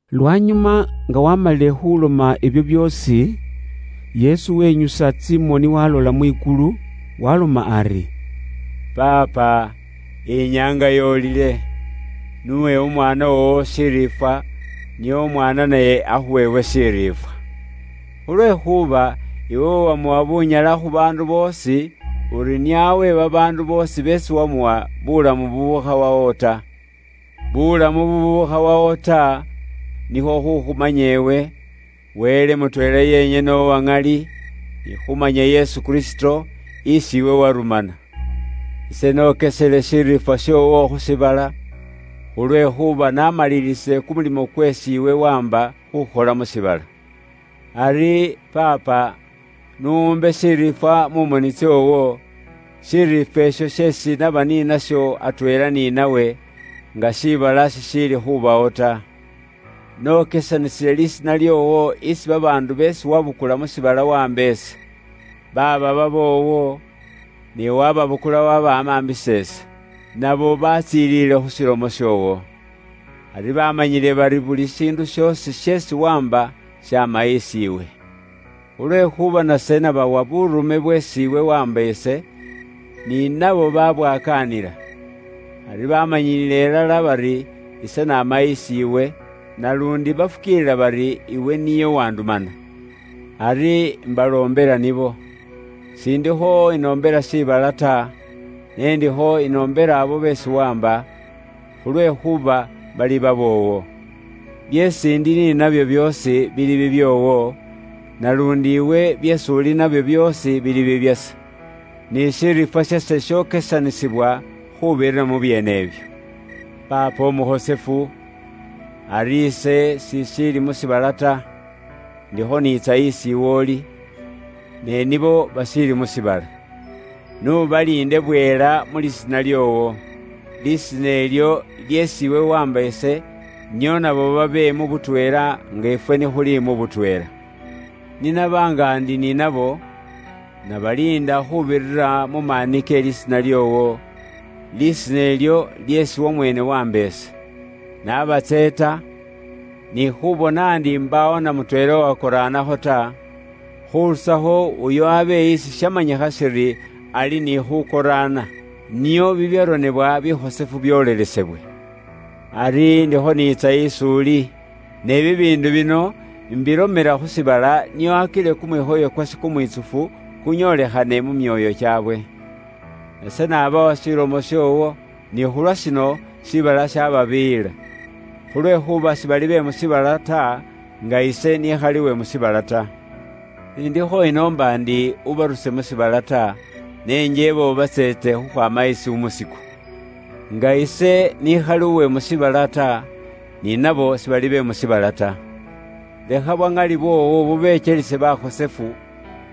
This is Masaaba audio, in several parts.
Lwanyuma nga waamalile khuloma ibyo byoosi, Yesu wenyusa tsimoni walola mwikulu waaloma ari, “Paapa, inyaanga yoolile. N'uwe Umwaana woowo shiriifwa, nio Umwaana naye akhuwe iwe shiriifwa. Khulwekhuuba iwe wamuwa bunyala khu baandu boosi, uri nio awe babaandu boosi beesi wamuwa, bulamu bubukhawawo ta. Bulamu bubukhawawo nikhwo khukhumanya iwe, Wele mutweela yenyene uwa ŋali, ni khumanya Yesu Kristo, isi iwe warumana. Ise nokesele shiriifwa shoowo khu shiibala, khulwekhuuba namalilisile kumulimo kweesi iwe waamba khukhola mu shiibala. Ari, Paapa, n'umbe shiriifwa mu moni tsoowo; shiriifwa isho sheesi naba ni nasho atweela ni nawe, nga shiibala shishiili khubawo ta. “Nokesanisile lisiina lyoowo isi babaandu beesi wabukula mu shiibala waamba ise. Baaba baboowo, ne waababukula wabamaambisa ise. Nabo batsiliile khu shilomo shoowo. Ari baamanyile bari buli shiindu shoosi sheesi waamba shaama isi iwe. Khulwekhuuba nase nabawa buurume bweesi iwe waamba ise, ni nabo babwakaanila. Ari baamanyiile ilala bari ise naama isi iwe, naluundi bafukiilila bari iwe niye uwandumana. “Ari imbaloombela nibo. S'indikho inoombela shiibala ta, ne indikho inoombela abo beesi waamba, khulwekhuuba bali baboowo. Byeesi ndi ni nabyo byoosi bili bibyoowo, naluundi iwe byeesi uli ni nabyo byoosi bili bibyase. Ni shiriifwa shase shokesanisibwa khuubirira mu byeene ibyo. “Paapa Umukhosefu, ari ise sishiili mu shiibala ta. Indikho niitsa isi iwe uli. Ne nibo bashiili mu shiibala. N'ubaliinde bwela mu lisiina lyoowo. Lisina ilyo lyeesi iwe waamba ise, nio nabo babe mu butweela nga ifwe ni khuli mu butweela. Ni naba nga ndi ni nabo, nabaliinda khuubirira mu maani ke lisiina lyoowo, lisiina ilyo lyeesi wamweene waamba ise. Nabatseeta, ni khubona ndi mbaawo n'amutweela uwahela ta, khurusakho uyo abe isi shamanyikha shiri ali ni khukoraana, nio bibyaronebwa bikhosefu byoolelesebwe. Ari indikho niitsa is'uli. Ne bibiindu bino imbilomela khu shiibala nio akile kumwikhoyo kwase kumwitsufu kunyoolikhane mu myoyo kyaabwe. Nase nabawa ilomo yoowo. Ni khulwashino, shiibala shaababiiyila. Khulwekhuuba sibali be mu shiibala ta, nga ise n'ikhali uwe mu shiibala ta. Shindikho inoomba ndi ubaruse mu shiibala ta, ne njeeba ubatseete khukhwaama isi umusiku. Nga ise nikhali uwe mu shiibala ta, ni nabo sibali be mu shiibala ta. Lekha bwa ŋali bwoowo bubekyelise bakhosefu,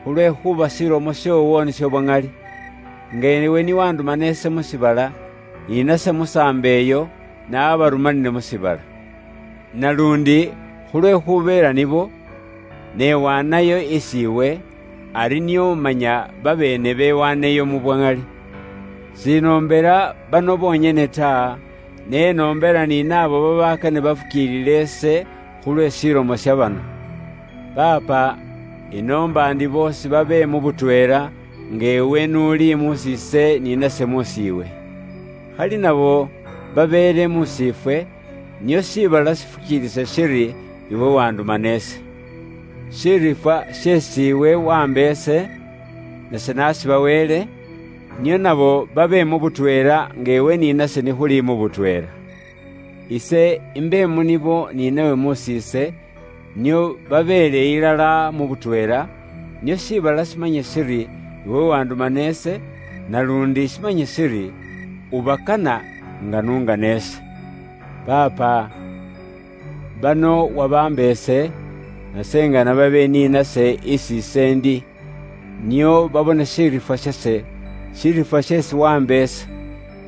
khulwekhuuba shilomo shoowo nisho bwa ŋali. Nga iwe ni wandumana ise mu shiibala, ni nase musaambo iyo, nabarumanile mu shiibala. Naluundi khulwekhubeela nibo, ise niwaanayo mu bukhosefu isi iwe, ari nio manya babeene bewaaneyo mu bwa ŋali. “Shinoombela bano bonyene ta, ne inoombela ni naabo babakane bafukiilile ise khulwe shilomo sha bano. Paapa, inoomba ndi boosi babe mu butweela, nga iwe n'uli mus'iise ni nase mus'iiwe. Khali nabo babeele mus'iifwe, nio shiibala shifukiilise shiri iwe wandumana ise. “Shiriifwa sheesi iwe waamba ise, nase nashibaweele, nio nabo babe mu butweela, nga iwe ni nase ni khuli butweela. Ise imbe mu nibo ni nawe mus'iise, nio babeele ilala mu butweela, nio shiibala shimanye shiri iwe wandumana ise, naluundi shimanye shiri ubakana nga n'ungana ise. “Paapa, bano wabaamba ise, nase ingana babe ni nase isi ise ndi, nio babone shiriifwa shase, shiriifwa sheesi waamba ise.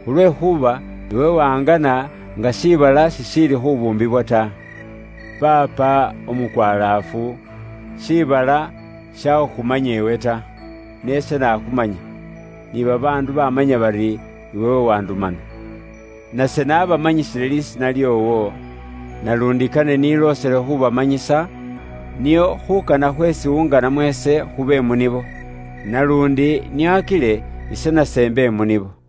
Khulwekhuuba iwe wangana nga shiibala shishiili khubuumbibwa ta. Paapa, Umukwalaafu, shiibala sishakhukhumanya iwe ta. Ne ise naakhumanya, ni babaandu bamanya bari iwe uwandumana. Nase naabamanyisile lisiina lyoowo, naluundi kane niloosele khuubamanyisa, nio khuukana khweesi iwe unganamo ise khube mu nibo. Naluundi nio akile ise nase imbe mu nibo.”